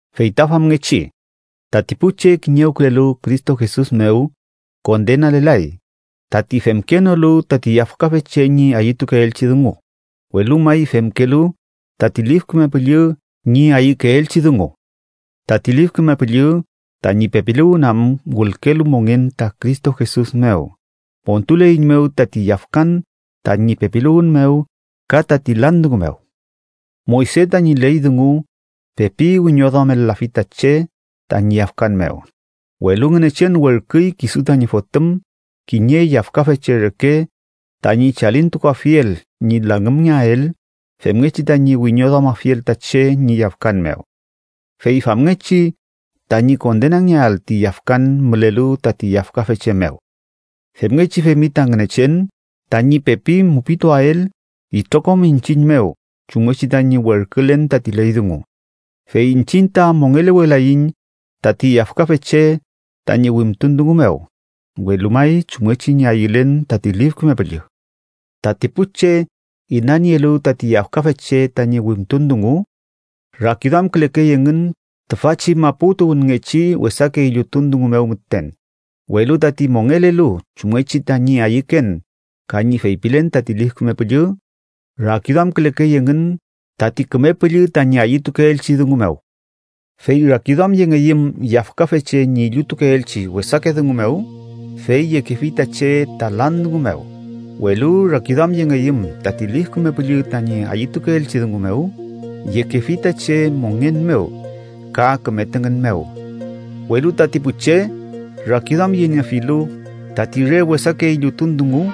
Fey ta famngechi, tati pu che kiñewkülelu Cristo Jesus mew, kondenalelay, tati femkenolu tati yafkafe che ñi ayütukeelchi dungu, welu may femkelu tati Lif Küme Püllü ñi ayükeelchi dungu. Tati Lif Küme Püllü tañi pepiluwün am wülkelu mongen ta Cristo Jesus mew, montuleiñmew tati yafkan tañi pepiluwün mew ka tati lan dungu mew. Moyse tañi ley dungu pepi wiñoduamel-lafi ta che tañi yafkan mew, welu Ngünechen werküy kisu tañi Fotüm kiñe yafkafe che reke tañi chalintukuafiel ñi langümngeael femngechi tañi wiñoduamafiel ta che ñi yafkan mew. Fey famngechi tañi kondenangeael ti yafkan mülelu tati yafkafe che mew. Femngechi femi ta Ngünechen tañi pepi mupituael itrokom iñchiñ mew chumngechi tañi werkülen tati ley dungu, fey iñchiñ ta mongelewelaiñ tati yafkafe che tañi wimtun dungu mew, welu may chumngechi ñi ayülen tati Lif Küme Püllü. Tati pu che inanielu tati yafkafe che tañi wimtun dungu, rakiduamkülekey engün tüfachi mapu tuwünngechi wesake illutun dungu mew müten, welu tati mongelelu chumngechi tañi ayüken ka ñi feypilen tati Lif Küme Püllü, rakiduamkülekey engün tati Küme Püllü tañi ayütukeelchi dungu mew. Fey rakiduamyengeyüm yafkafe che ñi illutukeelchi wesake dungu mew, fey yekefi ta che ta lan dungu mew, welu rakiduamyengeyüm tati Lif Küme Püllü tañi ayütukeelchi dungu mew, yekefi ta che mongen mew ka küme tüngün mew. Welu tati pu che rakiduamyeniefilu tati re wesake illutun dungu,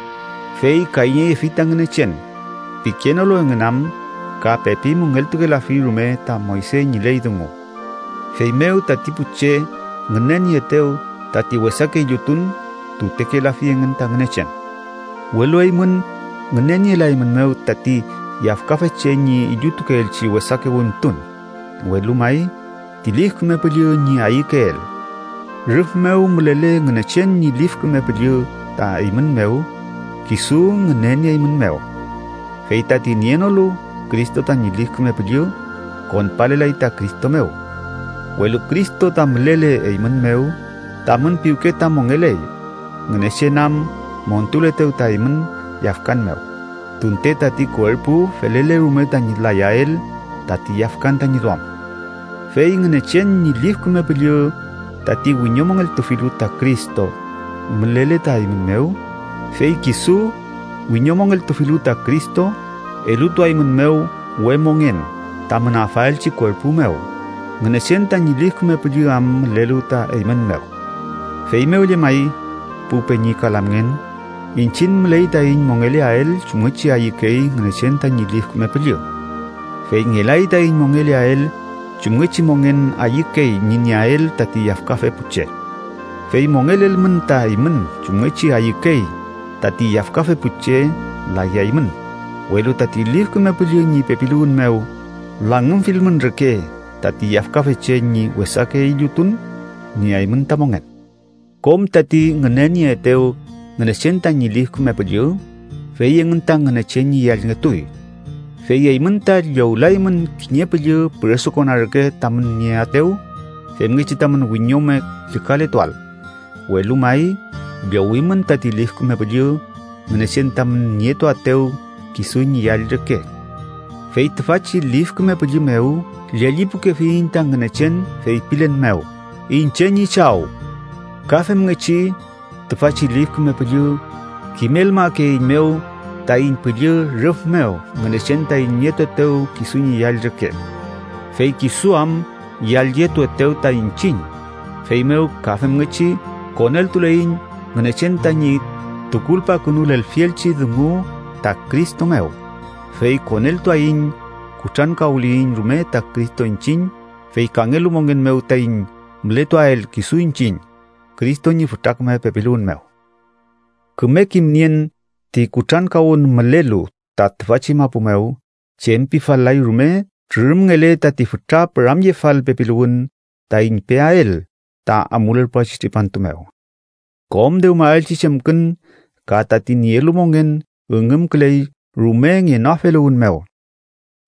fey kayñeyefi ta Ngünechen, pikenolu engün am ka pepi müngeltukelafi rume ta Moyse ñi ley dungu. Feymew tati pu che ngünenieetew tati wesake illutun, tutekelafi engün ta Ngünechen. Welu eymün ngünenielaeymünmew tati yafkafe che ñi illutukeelchi wesake wimtun, welu may, ti Lif Küme Püllü ñi ayükeel. Rüf mew mülele Ngünechen ñi Lif Küme Püllü ta eymün mew, kisu ngünenieeymünmew. Fey tati nienolu Cristo tañi Lif Küme Püllü, konpalelay ta Cristo mew. Welu Cristo ta mülele eymün mew, tamün piwke ta mongeley, Ngünechen am montuletew ta eymün yafkan mew, tunte tati kuerpu felele rume tañi layael tati yafkan tañi duam. Fey Ngünechen ñi Lif Küme Püllü, tati wiñomongeltufilu ta Cristo, mülele ta eymün mew, fey kisu, wiñomongeltufilu ta Cristo, elutuaeymünmew we mongen tamün afaelchi kuerpu mew, Ngünechen tañi Lif Küme Püllü am mülelu ta eymün mew. Feymew llemay, pu peñi ka lamngen, iñchiñ müley taiñ mongeleael chumngechi ayükey Ngünechen tañi Lif Küme Püllü. Fey ngelay taiñ mongeleael chumngechi mongen ayükey ñi nieael tati yafkafe pu che. Fey mongelelmün ta eymün chumngechi ayükey tati yafkafe pu che, layaymün, welu tati Lif Küme Püllü ñi pepiluwün mew langümfilmün reke tati yafkafe che ñi wesake illutun, nieaymün ta mongen. Kom tati ngünenieetew Ngünechen tañi Lif Küme Püllü, fey engün ta Ngünechen ñi yallngetuy. Fey eymün ta llowlaymün kiñe püllü püresukona reke tamün nieaetew femngechi tamün wiñome llükaletuael, welu may llowimün tati Lif Küme Püllü Ngünechen tamün nietuaetew kisu ñi yall reke. Fey tüfachi Lif Küme Püllü mew llellipukefiyiñ ta Ngünechen, feypilen mew: “¡Iñche ñi Chaw!” Ka femngechi tüfachi Lif Küme Püllü kimelmakeeiñmew taiñ püllü rüf mew Ngünechen taiñ nietuetew kisu ñi yall reke. Fey kisu am yallyetuetew ta iñchiñ, feymew ka femngechi koneltuleiñ Ngünechen tañi tukulpakünulelfielchi dungu ta Cristo mew, fey koneltuaiñ kutrankawliyiñ rume ta Cristo iñchiñ, fey kangelu mongen mew taiñ mületuael kisu iñchiñ, Cristo ñi fütra küme pepiluwün mew. Küme kimnien ti kutrankawün mülelu ta tüfachi mapu mew chem pifal-lay rume trürümngele tati fütra püramyefal pepiluwün taiñ peael ta amulerpuachi tripantu mew. Kom dewmaelchi chemkün ka tati nielu mongen üngümküley rume ngenoafeluwün mew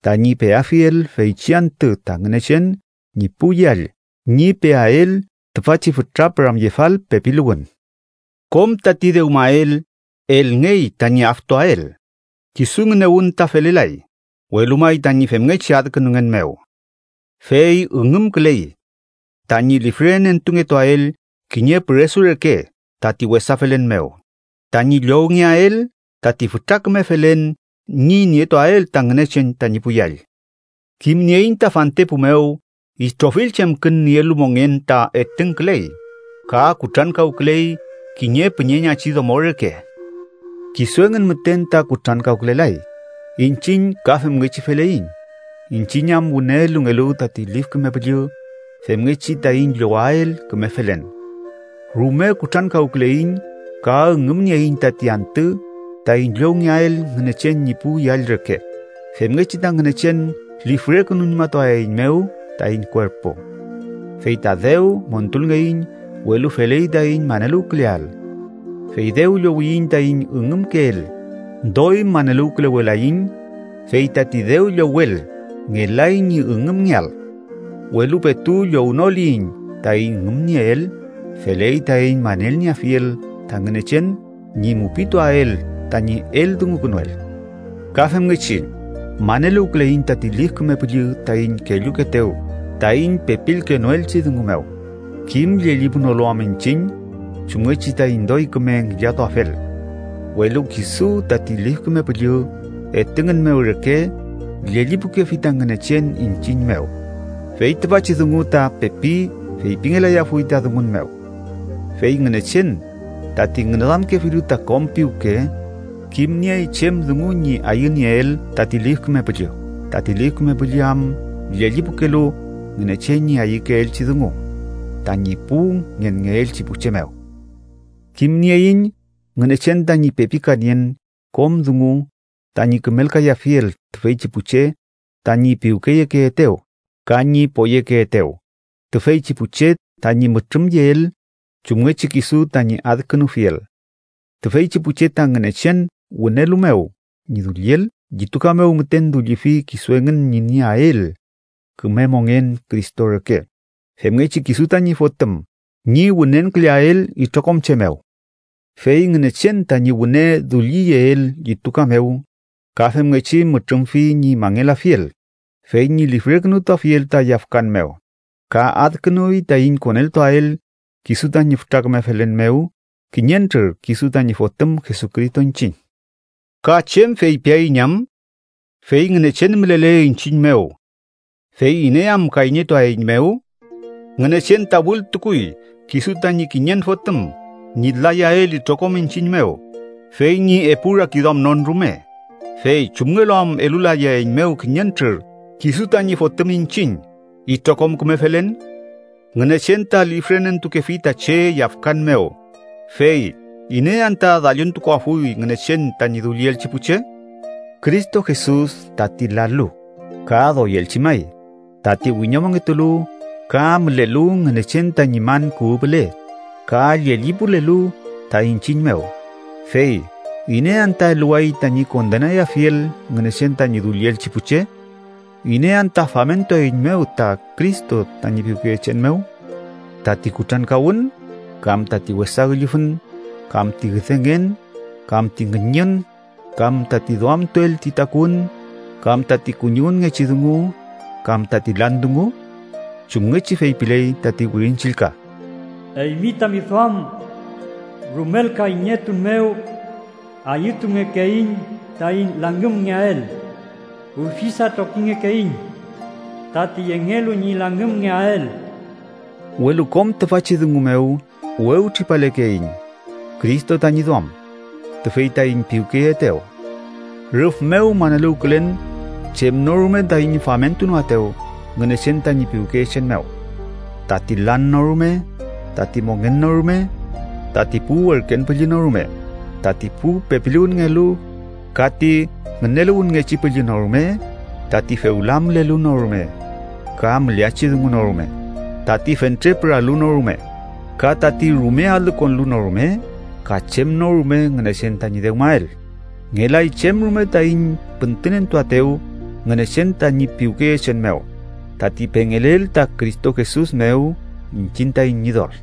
tañi peafiel feychi antü ta Ngünechen ñi pu yall ñi peael tüfachi fütra püramyefal pepiluwün. Kom tati dewmael elngey tañi aftuael, kisu ngünewün ta felelay, welu may tañi femngechi adkünungen mew. Fey üngümküley tañi lifrenentungetuael kiñe püresu reke tati wesa felen mew, tañi llowngeael tati fütra küme felen ñi nietuael ta Ngünechen tañi pu yall. Kimnieiñ ta fantepu mew itrofill chemkün nielu mongen ta etüngküley ka kutrankawküley kiñe püñeñachi domo reke. Kisu engün müten ta kutrankawkülelay, iñchiñ ka femngechi feleiñ, iñchiñ am wüne elungelu tati Lif Küme Püllü femngechi taiñ llowael küme felen. Rume kutrankawküleiñ ka üngümnieiñ tati antü taiñ llowngeael Ngünechen ñi pu yall reke, femngechi ta Ngünechen lifrekünuñmatuaeiñmew taiñ kuerpu. Fey ta dew montulngeiñ, welu feley taiñ maneluwküleael. Fey dew llowliyiñ taiñ üngümkeel, doy maneluwkülewelaiñ, fey tati dew llowel ngelay ñi üngümngeael. Welu petu llownoliyiñ taiñ üngümnieel, feley taiñ manelnieafiel ta Ngünechen ñi mupituael tañi eldungukünuel. Ka femngechi, maneluwküleiñ tati Lif Küme Püllü taiñ kellukeetew taiñ pepilkenoelchi dungu mew, kim llellipunolu am iñchiñ chumngechi taiñ doy küme ngillatuafel. Welu kisu tati Lif Küme Püllü etüngün mew reke llellipukefi ta Ngünechen iñchiñ mew, fey tüfachi dungu ta pepi feypingelayafuy ta dungun mew. Fey Ngünechen, tati ngüneduamkefilu ta kom piwke, kimniey chem dungu ñi ayünieel tati Lif Küme Püllü, tati Lif Küme Püllü am llellipukelu Ngünechen ñi ayükeelchi dungu tañi pu ngenngeelchi pu che mew. Kimnieiñ Ngünechen tañi pepikanien kom dungu tañi kümelkayafiel tüfeychi pu che tañi piwkeyekeetew ka ñi poyekeetew, tüfeychi pu che tañi mütrümyeel chumngechi kisu tañi adkünufiel. Tüfeychi pu che ta Ngünechen wünelu mew ñi dulliel, llituka mew müten dullifi kisu engün ñi nieael küme mongen Cristo reke, femngechi kisu tañi Fotüm ñi wünenküleael itrokom che mew. Fey Ngünechen tañi wüne dulliyeel llituka mew, ka femngechi mütrümfi ñi mangelafiel, fey ñi lifrekünutuafiel ta yafkan mew, ka adkünuy taiñ koneltuael kisu tañi fütra küme felen mew kiñentrür kisu tañi Fotüm Jesucristo iñchiñ. ¿Ka chem feypiaiñ am? Fey Ngünechen mülele iñchiñ mew, ¿fey iney am kayñetuaeiñmew? Ngünechen ta wültukuy kisu tañi kiñen Fotüm ñi layael itrokom iñchiñ mew fey ñi epu rakiduamnon rume, fey ¿chumngelu am elulayaeiñmew, kiñentrür kisu tañi Fotüm iñchiñ, itrokom küme felen? Ngünechen ta lifrenentukefi ta che yafkan mew, fey ¿iney anta dalluntukuafuy Ngünechen tañi dullielchi pu che? Cristo Jesus tati lalu, ka doyelchi may, tati wiñomongetulu ka mülelu Ngünechen tañi man kuwü püle ka llellipulelu ta iñchiñ mew, fey ¿iney anta eluway tañi kondenayafiel Ngünechen tañi dullielchi pu che? ¿Iney anta famentuaeiñmew ta Cristo tañi piwkeyechen mew? ¿Tati kutrankawün, kam tati wesa üllüfün, kam ti üdengen, kam ti ngüñün, kam tati duamtuel ti takuwün, kam tati kuñiwünngechi dungu, kam tati lan dungu? Chumngechi feypiley tati Wirin Chillka: “Eymi tami duam rumel kayñetun mew ayütungekeiñ taiñ langümngeael. Ufisa trokingekeiñ tati yengelu ñi langümngeael.” Welu kom tüfachi dungu mew wewtripalekeiñ Cristo tañi duam, tüfey taiñ piwkeyeetew. Rüf mew maneluwkülen chem no rume taiñ famentunoaetew Ngünechen tañi piwkeyechen mew: tati lan no rume, tati mongen no rume, tati pu werken püllü no rume, tati pu pepiluwünngelu ka ti ngüneluwünngechi püllü no rume, tati fewla mülelu no rume, ka müleachi dungu no rume, tati fentre püralu no rume, ka tati rume alü konlu no rume, ka chem no rume Ngünechen tañi dewmael. ¡Ngelay chem rume taiñ püntünentuaetew Ngünechen tañi piwkeyechen mew, tati pengelel ta Cristo Jesus mew iñchiñ taiñ Ñidol!